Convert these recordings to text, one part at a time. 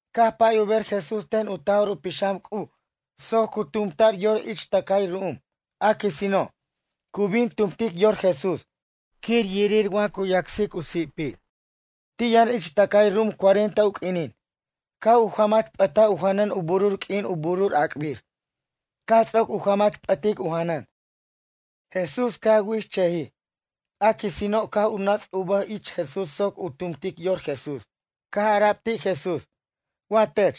Caj pay u ber Jesús ten u Taj'or u Pixam C'uj soc cu tumta'r yor ich tʌcay ru'um. A quisino', cu bin tumtic yor Jesús, quir yirir wa cu yacsic u si'pir. Ti' yʌn ich tʌcay ru'um cuarenta u q'uinin. Caj u jamach p'at u janʌn u burur q'uin u burur ac'bir. Caj ts'oc u jamach p'ʌtic u janʌn. Jesús caj wichʌjij. A quisino', caj u nʌts' u bʌj ich Jesús soc u tumtic yor Jesús. Caj ara'b ti' Jesús: ―Wa tech,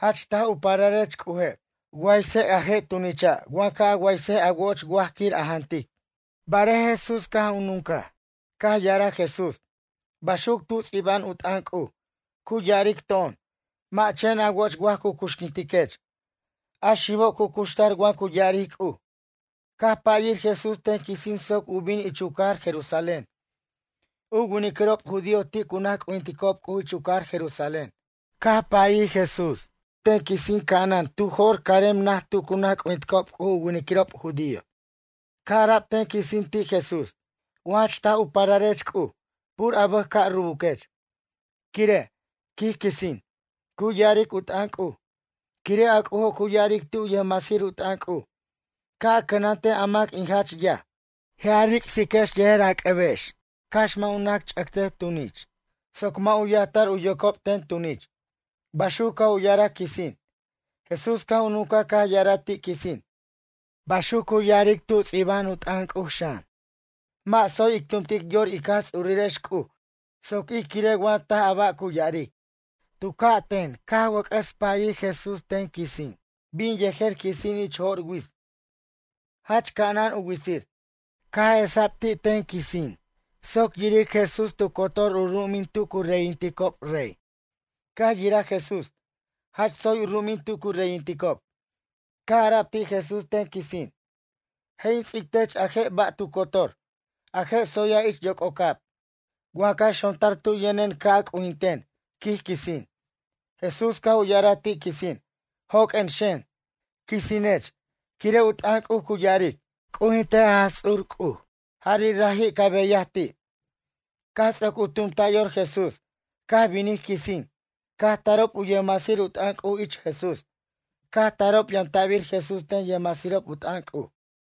jach taj u pararech C'uje', waysej a je' tunicha' waj ca' a waysej a wo'och waj quir a jantic. Barej Jesús caj u nuncaj. Caj ya'araj Jesús: ―Baxuc tu ts'iba'an u t'ʌn C'uj, cu ya'aric to'on: “Mʌ' chen a woch waj cu cuxquintiquech. A xibo' cu cuxtar wa cu ya'aric C'uj.” Caj payir Jesús ten quisin soc u bin ich u cajar Jerusalén. U winiquirob judío ti' cu naj c'ujinticob C'uj ich u cajar Jerusalén. Caj payir Jesús ten quisin ca'anan tu jo'r carem naj tu cu naj c'ujinticob C'uj u winiquirob judío. Caj ara'b ten quisin ti' Jesús: ―Wa jach taj u pararech C'uj, pur a bʌj ca' rubuquech. Quire' ―quij quisin― cu ya'aric u t'ʌn C'uj: Quire' a C'ujo' cu ya'aric ti' u yʌjmasir u t'ʌn C'uj: “Ca' a cʌnantej a mac in jach yaj. Je' a ric'siquex yejer a c'ʌbex cax mʌ' u nac ch'ʌctej tunich, soc mʌ' u yajtar u yocob ten tunich.” Baxuc caj u ya'araj quisin. Jesús caj u nuncaj caj ya'araj ti' quisin: ―Baxuc cu ya'aric tu ts'iba'an u t'ʌn C'uj xan: “Mʌ' tsoy ic tumtic yor ic Jaj Ts'urirex C'uj soc ij quirej wa taj a ba' cu ya'aric.” Tu ca' ten wʌc'ʌs payir Jesús ten quisin. Bin yejer quisin ich jo'r wits. Jach ca'anan u witsir. Caj esa'b ti' ten quisin soc yiric Jesús tu cotor u ru'umin tu cu reyinticob rey. Caj yiraj Jesús, jach tsoy u ru'umin tu cu reyinticob. Caj ara'b ti' Jesús ten quisin: ―Je' in ts'ic tech a je' ba' tu cotor, a je' tsoya' ich yoc'ocab, wa ca xontar tu yʌnen ca' a c'ujinten ―quij quisin. Jesús caj u ya'araj ti' quisin: ―Joq'uen xen, quisinech. Quire' u t'ʌn C'uj cu ya'aric: “C'ujintej a Jaj Ts'ur C'uj. Jari' raji' ca beyaj ti'.” Caj ts'oc u tumta' yor Jesús, caj binij quisin, caj tarob u yʌjmasir u t'ʌn C'uj ich Jesús. Caj tarob yamta'bir Jesús ten yʌjmasirob u t'ʌn C'uj.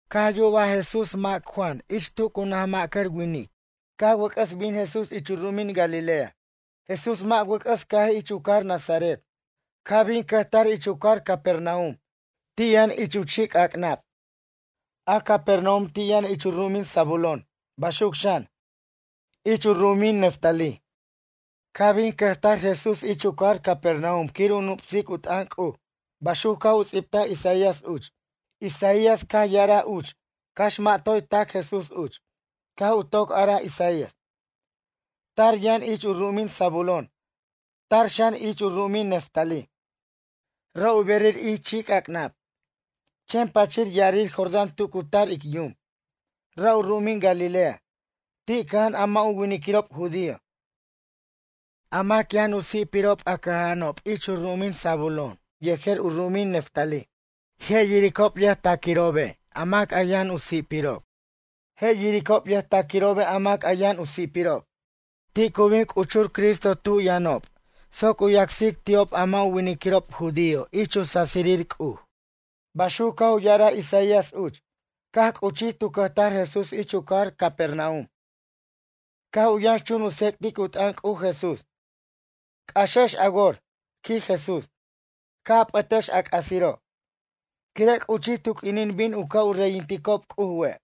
Caj yubaj Jesús mac Juan ich tu cu naj ma'cʌr winiquir. Caj wʌc'ʌs bin Jesús ich u ru'umin Galilea. Jesús mʌ' wʌc'ʌs cajij ich u cajar Nazaret. Caj bin u cʌjtar ich u cajar Capernaum. Ti' yʌn ich u chi'c'ac'nab. A Capernaum ti' yʌn ich u ru'umin Zabulón. Baxuc xan, ich u ru'umin Neftalí. Caj bin cʌjtar Jesús ich u cajar Capernaum quir u nup'sic u t'ʌn C'uj, baxuc caj u ts'ibtaj Isaías uch. Isaías caj ya'araj uch, cax mʌ' toy tac Jesús uch. Caj u toc araj Isaías: Tar yʌn ich u ru'umin Zabulón. Tar xan ich u ru'umin Neftalí. Ra' u berir ich chi'c'ac'nab. Chen pʌchir ya'arir Jordán tu cu tar ic yum. Ra' u ru'umin Galilea, ti' cʌja'an a mʌ' u winiquirob judío. A mac yʌn u si'pirob, a cʌja'anob ich u ru'umin Zabulón yejer u ru'umin Neftalí. Je' yiricob yʌjtaquirobe' a mac a yʌn u si'pirob. A mac ti' cʌja'an ich yac'birir quire' yʌn u si'pirob, ti' cu bin c'uchur Cristo tu yʌnob soc u yacsic ti'ob a mʌ' u winiquirob judío ich u sasirir C'uj. Baxuc caj u ya'araj Isaías uch. Caj c'uchij tu cʌjtar Jesús ich u cajar Capernaum. Caj u yʌnxchun u tsec'tic u t'ʌn C'uj Jesús: ―C'axex a wor ―quij Jesús―. Ca' a p'ʌtex a c'asiro', quire' c'uchij tu q'uinin bin u ca' u reyinticob C'uj we'.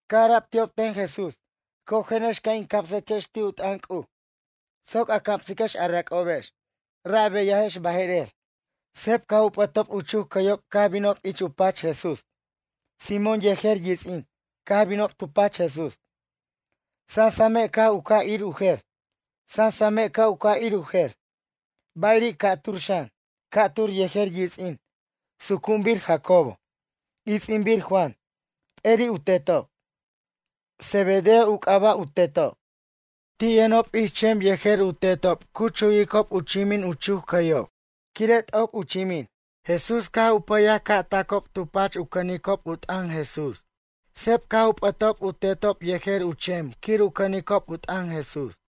Caj ara'b ti'ob ten Jesús: ―Cojenex ca' in camsechex ti' u t'ʌn C'uj, soc a camsiquex a rac'obex. Ra' a beyajex baje'rer. Seb caj u p'ʌtob u chuc cʌyob caj binob ich u pach Jesús. Simón yejer yits'in, caj binob tu pach Jesús. Sansame' ca' u ca' ir u jer. Ba'iri' ca'tur xan. Ca'tur yejer yits'in. Sucu'unbir Jacobo. Its'inbir Juan. P'eri' u tetob. Zebedeo u c'aba' u tetob. Ti' yʌnob ich chem yejer u tetob cu chuwicob u chimin u chuc cʌyob, quire' t'oc u chimin. Jesús caj u payaj ca' tacob tu pach u cʌnicob u t'ʌn Jesús. Seb caj u p'ʌtob u tetob yejer u chem quir u cʌnicob u t'ʌn Jesús.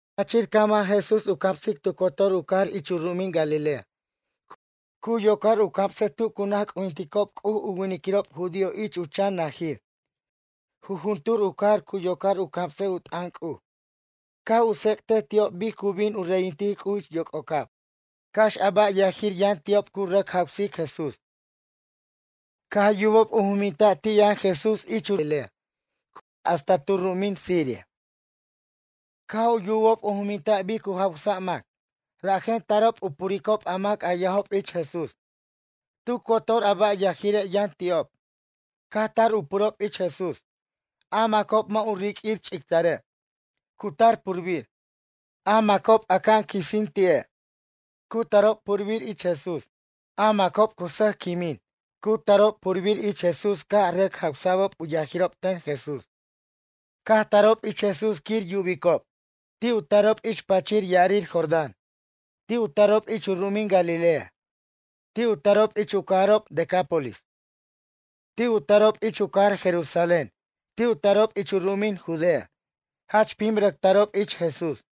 Pachir caj man Jesús u camsic tu cotor u cajar ich u ru'umin Galilea. Cu yocar u camsej tu cu naj c'ujinticob C'uj u winiquirob judío ich u chan najir. Jujuntur u cajar cu yocar u camsej u t'ʌn C'uj. Caj u tsec' ti'ob bic cu bin u reyintic C'uj ich yoc'ocab. Cax a ba' yajir yʌn ti'ob cu rʌc jawsic Jesús. Caj yubob u juminta' ti' yʌn Jesús ich u ru'umin Galilea hasta tu ru'umin Siria. Caj u yubob u juminta' bic cu jawsic mac, rajen tarob u puricob a mac yajob ich Jesús. Tu cotor a ba' yajire' yʌn ti'ob, caj tar u purob ich Jesús. A macob mʌ' u riq'uir ch'ictare', cu tar purbir. A macob aca'an quisin ti'e', cu tarob purbir ich Jesús. A macob cu sʌjquimin, cu tarob purbir ich Jesús caj rʌc jawsa'b u yajirob ten Jesús. Caj tarob ich Jesús quir yubicob. Ti' u tarob ich pʌchir ya'arir Jordán. Ti' u tarob ich u ru'umin Galilea. Ti' u tarob ich u cajarob Decápolis. Ti' u tarob ich u cajar Jerusalén. Ti' u tarob ich u ru'umin Judea. Jach pim rʌc tarob ich Jesús.